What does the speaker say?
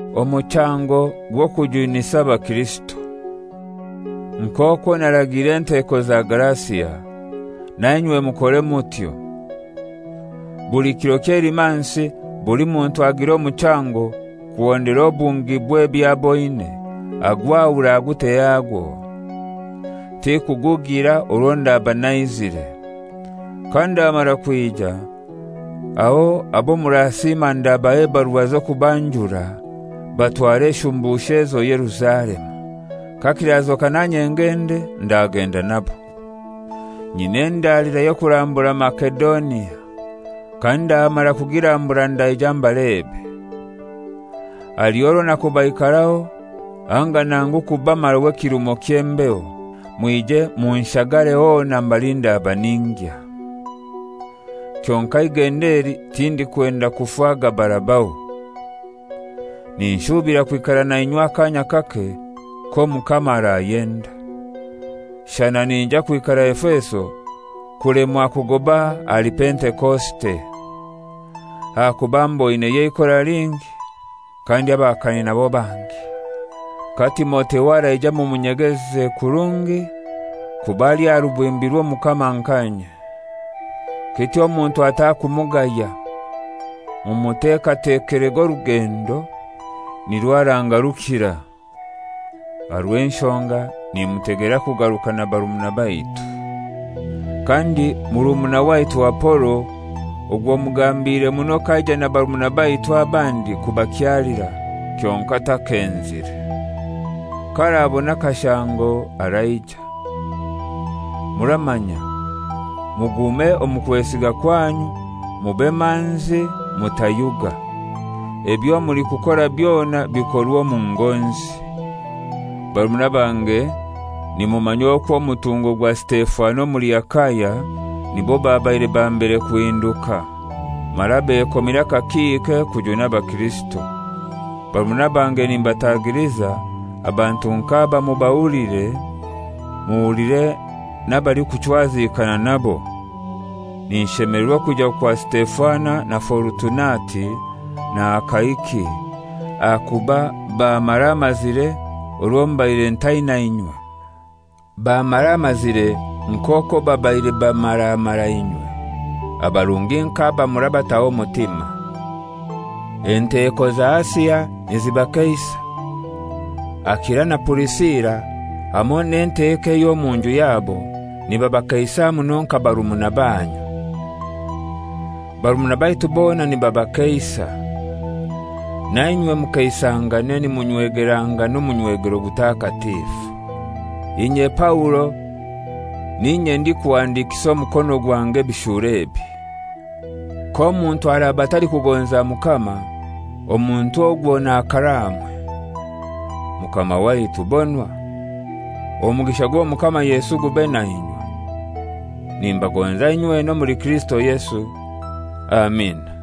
Omuchango gw'okujunisa abakirisito: Nk'okwo naragiire enteko za Galasia, na inywe mukore mutyo. Buli kiro ky'Eilimansi buli muntu agire omuchango kuhondera obungi bw'eby'aboine, agwahure agute hagwo; tikugugira orwo ndaba naizire. Kandamara kwija, aho abo murasiima ndabaha ebarua z'okubanjura, batware eshumbusho ezo Yerusalemu. Kakirazoka nanye ngende, ndagenda nabo. Nyina endalira y'okurambura Masedonia. Kandamara kugirambura ndaija mbalebe. Haliho orwo nakubaikaraho, anga nangu kubamaraho ekirumo ky'embeho, mwije munshagare hona mbali ndaba ningya. Kyonkai igenda eli tindikwenda kufa gabarabaho; ninshuubira kwikara nainywe akaanya kake, k'Omukama arayenda. Shana ninyija kwikara Efeso kulemwa kugoba ahali Pentekosite; ahakuba mboineyo eikora lingi, kandi abahakani nabo bangi. Ka Timotheo araija mumunyegeze kurungi, kuba ali aha rubimbi rw'Omukama nka inye. Kityo omuntu atakumugaya. Mumutekatekerege orugendo, nirwo aragarukira owange; aha rw'enshonga nimutegera kugaruka na barumuna baitu. Kandi murumuna waitu Apolo ogwo mugambire muno k'aija na barumuna baitu abandi kubakyalira, kyonkai takenzire. K'arabona akashango araija. Muramanya, mugume omu kwesiga kwanyu, mube manzi, mutayuga. Ebyo mulikukora byona bikorwe omu ngonzi. Barumuna bange, nimumanya okwo omutungo gwa Sitefana omuli Akaya nibo babaire ba mbere kuhinduka, mara bekomire akakiike kujuna abakirisito. Barumuna bange nimbatagiliza, abantu nk'aba mubahulire, muhulire n'abalikuchwazikana nabo. Ninshemelerwa okwija kwa Sitefana na Forutunati, na Akaiki, ahakuba bammaramazire orwo mbaire ntaina inywe; bammaramazire nk'okwo babaire bamaramara inywe. Abarungi nk'aba murabataho omutima. Enteko za Asia nizibakeisa. Akila na Purisila, hamoi n'enteko ey'omu nju yabo nibabakeisa muno nka barumuna banyu. Barumuna baitu bona nibabakeisa. Na inywe mukeisangane nimunywegerangana omunywegero gutakatifu. Inye, Paulo, n'inye ndikuhandikisa omukono gwange ebishuuro ebi. K'omuntu araba atalikugonza Mukama, omuntu ogwo n'akaraamwe. Mukama waitu, bonwa! Omugisha gw'Omukama Yesu gube na inywe. Nimbagonza inywena omuli Kirisito Yesu. Amina.